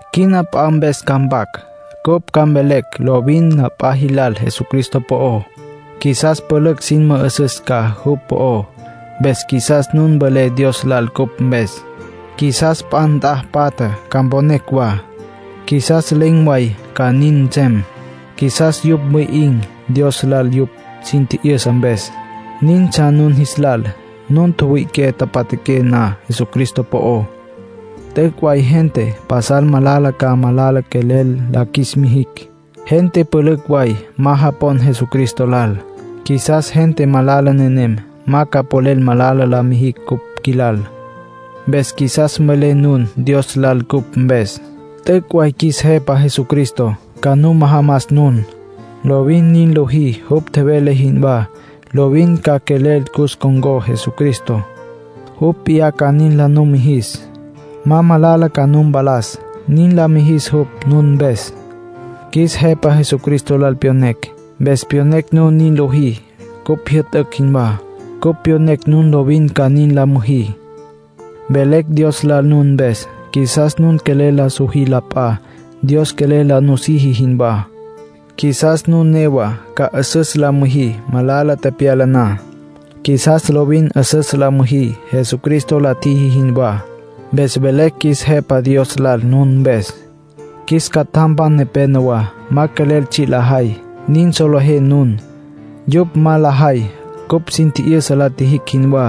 Quina p'a mpes ca mpac. Cupj ca mvelecj lovin la p'a jilal Jesucristo po'ó. Qjuisas pülücj sin mü'üsüs ca jupj po'ó, mpes qjuisas nun mvelé Dios lal cupj mpes. Qjuisas p'a nt'a patja ca mponecj wa; qjuisas len̈ way ca nin nsem. Qjuisas yupj mwi'in̈ Dios lal yupj sin tji'yüsa mpes. Nintsja nun jis lal: nun tjüwüi'iqué tjapja'aqué na Jesucristo po'ó. T'üc' way gente pasal malala ca malala quelel la qjuis mijicj. Gente pülücj way ma japon Jesucristo lal. Qjuisas gente malala nenem ma ca polel malala la mijicj cupj qjuilal. Mpes qjuisas mvelé nun Dios lal cupj mpes. T'üc' way qjuis Jepa Jesucristo ca nu majamas nun. Lovin nin liji jupj tjevele jinwá. Lovin ca quelel cus con̈có Jesucristo, jupj p'iyá ca nin la numijis. Ma malala ca nu mpalas, nin la mijis jupj nun mpes. Qjuis Jepa Jesucristo lal pyonecj, mpes pyonecj nun nin lojí cupj jyü'tücj jinwá. Cupj pyonecj nun lovin ca nin la müjí. Velecj Dios lal nun mpes; qjuisas nun quelel la sojí la p'a, Dios quelel la siji jinwá. Qjuisas nun newa ca 'üsüs la müjí malala tepyala na. Qjuisas lovin 'üsüs la müjí Jesucristo la tjiji jinwá. Mpes velecj qjuis Jepa Dios lal nun mpes. Qjuis catjampan nepénowa ma quelel tsji' lajay. Nin solejé nun. Yupj ma lajay cupj sin tji'yüsa la tjijicj jinwá.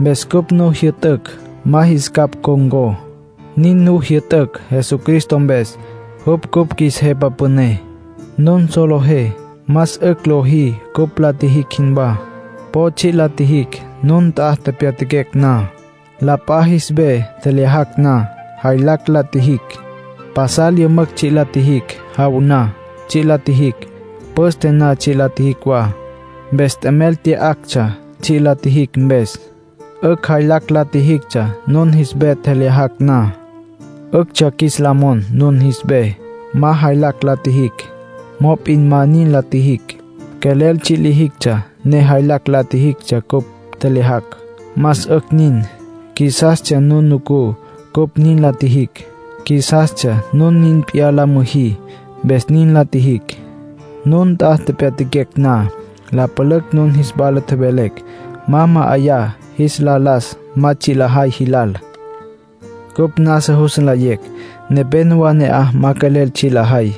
Mpes cupj nu jyü'tücj ma jis capj ncon̈có. Nin nu jyü'tücj Jesucristo mpes, jupj cupj qjuis Jepa Püné. Nun solejé más 'ücj lojí cupj la tjijicj jinwá. Po tsji' la tjijicj, nun nt'a tepyatjaquecj na. La p'a jis ve tjelyajacj na, jaylacj la tjijicj. Pasal yümücj tsji' la tjijicj. Jaw na, tsji' la tjijicj. Püste na, tsji' la tjijicj wa. Mpes t'emel tya'actsja tsji' la tjijicj mpes. 'Ücj jaylacj la tjijictsja nun jis ve tjelyajacj na. 'Üctsja qjuis la mon nun jis ve, ma jaylacj la qjuijicj. Mop'in ma nin la tjijicj. Quelel tsji' lijictsja, ne jaylacj lijictsja cupj tjelyajacj. Más 'ücj nin. Qjuisastsja nun nucú cupj nin la tjijicj; qjuisastsja nun nin p'iyá la müjí, mpes nin la tjijicj. Nun nt'a tepyatjaquecj na, la pülücj nun jis wala tjevelecj ma ma'ayá jis la las ma tsji' lajay jilal. Cupj nasa jus nlayecj nepénowa ne'aj ma quelel tsji' lajay,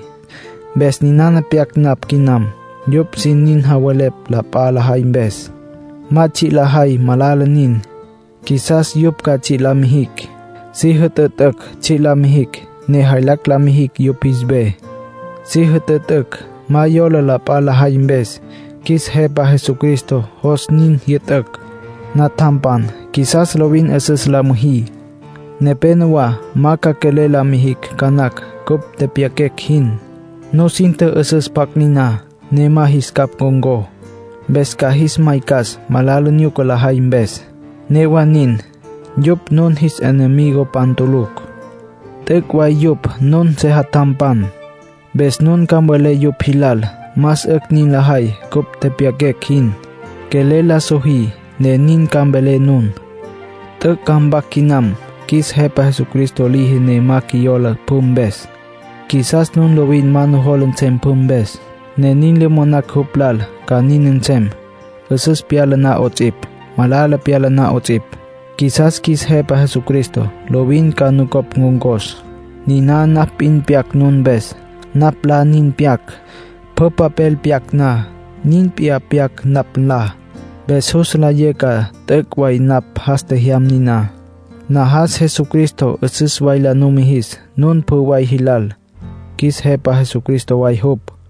mpes ninana pyac napj quinam. Yupj sin javelepj la p'a lajay mpes. Ma tsji' lajay. Malala nin. Qjuisas yupj ca tsji' la mijicj. Si jütütücj tsji' la mijicj, ne jaylacj la mijicj yupj jis ves. Si jütütücj ma yola la p'a lajay mpes. Qjuis Jepa Jesucristo jos nin jyü'tücj. Natjampan, qjuisas lovin 'üsüs la müjí. Nepénowa ma ca quelel la mijicj ca nacj cupj tepyaquecj jin. Nusin tjü'üsüs pjacj niná, ne ma jis capj ncon̈có. Mpes ca jis maycas malala nyuca lajay mpes. Newa nin, yupj nun jis enemigopan tulucj. T'üc' way yupj nun sejatjampan. Mpes nun ca mvelé yupj jilal más 'ücj nin lajay cupj tepyaquecj jin. Quelel la sojí, ne nin ca mvelé nun. T'üc' ca mpac quinam. Qjuis Jepa Jesucristo liji ne ma qjuiyola pjü mpes. Qjuisas nun lovin ma nujola nsem pjü mpes, ne nin le monacj jupj lal ca nin nsem, 'üsüs pyala na 'ots'ipj, malala pyala na 'ots'ipj. Qjuisas qjuis Jepa Jesucristo lovin ca nucopj ncon̈cos. Niná napj p'in pyac nun mpes. Napj nlá nin pyac. Pjü papel pyac na, nin p'iyá pyac napj nlá. Mpes jus nlayé ca t'üc' way napj jas tjejyam niná. Najas Jesucristo 'üsüs way la numijis nun pjü way jilal, qjuis Jepa Püné way jupj.